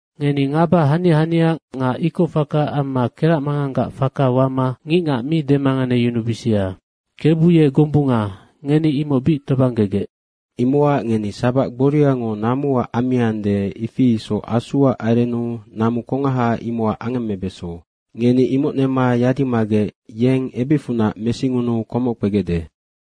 Ngeni ngaba hania hania nga ikocfaka amma keracmanganggac faka wama ngicngac mi demanganeyunubisia. KEBU ye gombunga, ngeni imoc bic tobanggegec. Imocac ngeni sabac gboriango namuac ammiande, ifi isoc Asuac arennu namu kongaha imocac angemmebeso. Ngeni imoc nema yadimagec yeng ebicfunac mesingunuu komoc kpegecde.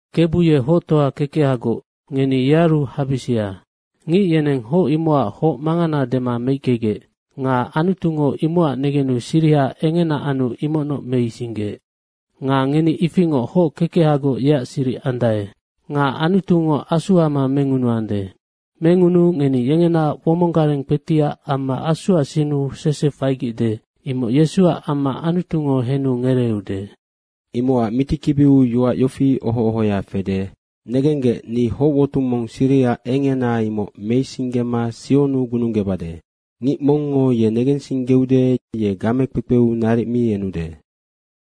Kebu ye hoctoa kekehagoc, ngeni yearu habisia. Ngic yeneng hoc imocac hoc mangana dema meickegec. Nga Anutungo imocac negenu siriha engena anu imocnoc meisinggeec. Nga ngeni ifingoc hoc kekehagoc yeac siric andae. Nga Anutungo asu ama mengunuande. Mengunuu ngeni yengena womong gareng kpetiac amma Asuac sinnu sese faigecde, imoc Yesuac amma Anutungo henu ngereeude. Imocac mitikibiu yoac yofi oho ohoya fede, “Negenggec, ni hocwotung mong siriha engena imoc meisinggema Sionnu gununggebade. Ngic mongngo ye negensinggeude, ye gamekpekpeu naric mi enude.”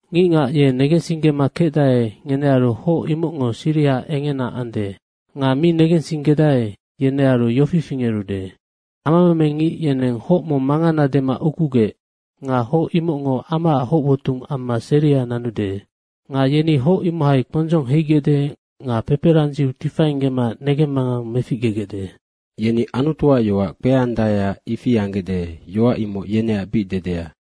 Ngicngac ye negensinggema kecdae, ngenearu hoc imocngo siriha engena ande. Nga mi negensinggedae, yenearu yofi fingerude, “Amameme ngic yeneng hoc mong mangana dema ukugec. Nga hoc imocngo amaac hoc wotung amma seria nanude.” “Nga yeni hoc imohai kpondzong heigecde nga peperandziu tifainggema negemmangang meficgegecde.” Yeni Anutuac yoac kpeandaeac ifi anggecde, yoac imoc yeneac bic dedea.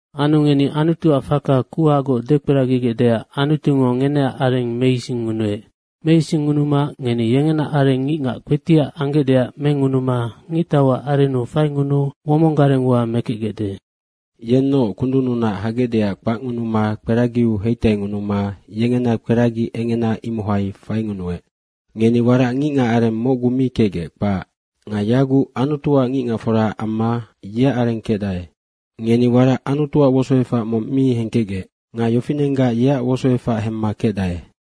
Anu ngeni Anutuac faka kuhagoc dekperagigecdeac Anutungo ngeneac areng meisingngunuec. Meisingngunuma ngeni yengena areng ngicngac kpetiac anggecdeac mengunuma ngictauac arennu faingunuu womong garengua mekecgecde. Yennoc kundunnunac hagecdeac kpacngunuma kperagiau heitaingunuma yengena kperagi engena, imohai faingunuec. Ngeni warac ngicngac areng mocgu mi kecgec, kpac. Nga yaguc Anutuac ngicngacfora amma yeac areng kecdae. Ngeni warac Anutuac wosoefac mong mi hengkecgec. Nga yofinenggac yeac wosoefac hemma kecdae.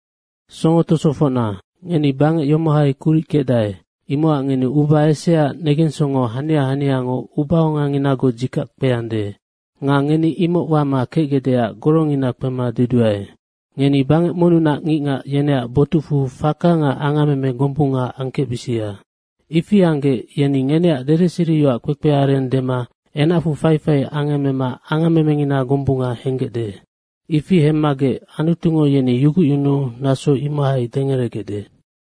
Songo tosofocna, ngeni bangec yomohai kuric kecdae, imocac ngeni uba eseaac negensongo hania haniango ubaonganginagoc dzikac kpeande nga ngeni imoc wama kecgecdeac gorongina kpema deduae. Ngeni bangec monnunac ngicngac, yeneac botucfu faka nga angammeme gombunga angkecbisia. Ifi anggec yeni ngeneac dedeseriyoac kpekpeareng dema enacfu faifai angemmema angammemengina gombunga henggecde. Ifi hemmagec Anutungo yeni yugucyunuu naso imohai dengeregecde.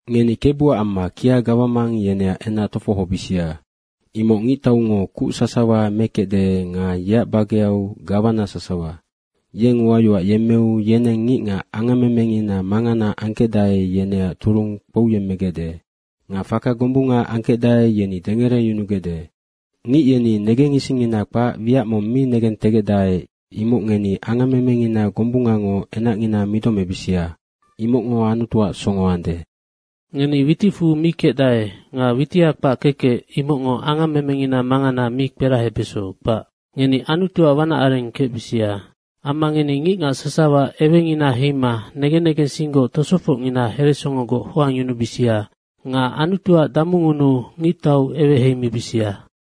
Ngeni Kebuac amma kia gawamang, yeneac enac tofohobisia. Imoc ngictaungo kuc sasawa mekecde nga yeac bageau gawana sasawa. Yeng uayoac yemmeu yeneng ngicngac angammemengina mangana angkecdae, yeneac turung kpouyemmegecde. Nga faka gombunga angkecdae, yeni dengereyunugecde. Ngic yeni negen isingngina kpac wiac mong mi negentegecdae, imoc ngeni angammemengina gombungango enacngina midomebisia, imocngo Anutuac songo ande. Ngeni witicfu mi kecdae nga witiha kpac kekec, imocngo angammemengina mangana mi kperahebeso, kpac. Ngeni Anutuac wanac areng kecbisia. Amma ngeni ngicngac sasawa ewengina heima negen negensinggoc tosofocngina heresongogoc hoangyunubisia nga Anutuac damungunuu ngictau eweheimibisia.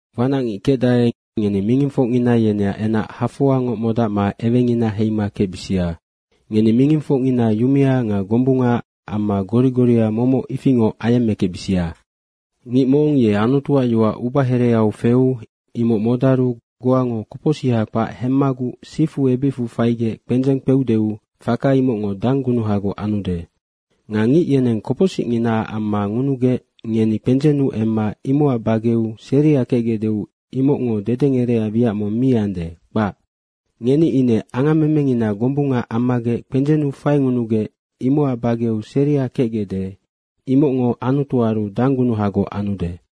Wanacngic kecdae, ngeni mingingfocngina yeneac enac hafoangoc modacma ewengina heima kecbisia. Ngeni mingingfocngina yumea nga gombunga amma gori goria momoc ifingoc ayemmekecbisia. Ngic mong ye Anutuac yoac ubahereau feu imoc modaru goango kopocsiha kpac hemmaguc sifu ebicfu faigec kpendzeng kpeudeu faka imocngo danggunuhagoc anude. Nga ngic yeneng kopocsicnginaac amma ngunugec ngeni kpendzennu emma imocac bageu seria kecgecdeu imocngo dedengerecac wiac mong mi ande, kpac. Ngeni ine angammemengina gombunga ammagec kpendzennu faingunugec imocac bageu seria kecgecde, imocngo Anutuaru danggunuhagoc anude.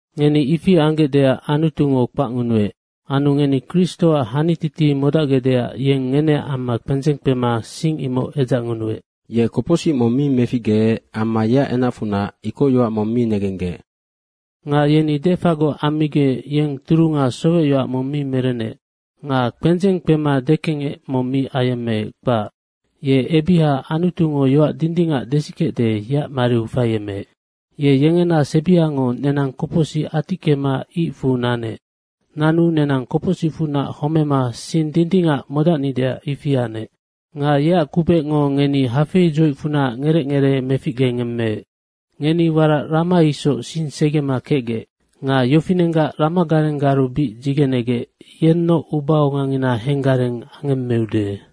Ngeni ifi anggecdeac Anutungo kpacngunuec. Anu ngeni Kristoac hanititi modacgecdeac yeng ngeneac amma kpendzeng kpema sing imoc edzacngunuec. Ye kopocsic mong mi meficgeec amma yeac enacfunac ikocyoac mong mi negenggec. Nga yeni defagoc ammigec yeng turunga sowecyoac mong mi merenec. Nga kpendzeng kpema dekengec mong mi ayemmeec, kpac. Ye ebiha Anutungo yoac dindingac desikecde, yeac mariu faiemeec. Ye yengena sebiango nenang kopocsic atickema icfu nanec. Nanu nenang kopocsicfunac homema sing dindingac modacnideac ifi anec. Nga yeac kubecngo ngeni hafeidzoicfunac ngerec ngeree meficgengemmeec. Ngeni warac rama isoc sing segema kecgec. Nga yofinenggac ramagarenggaru bic dzigenegec yennoc ubaongangina henggareng angemmeude.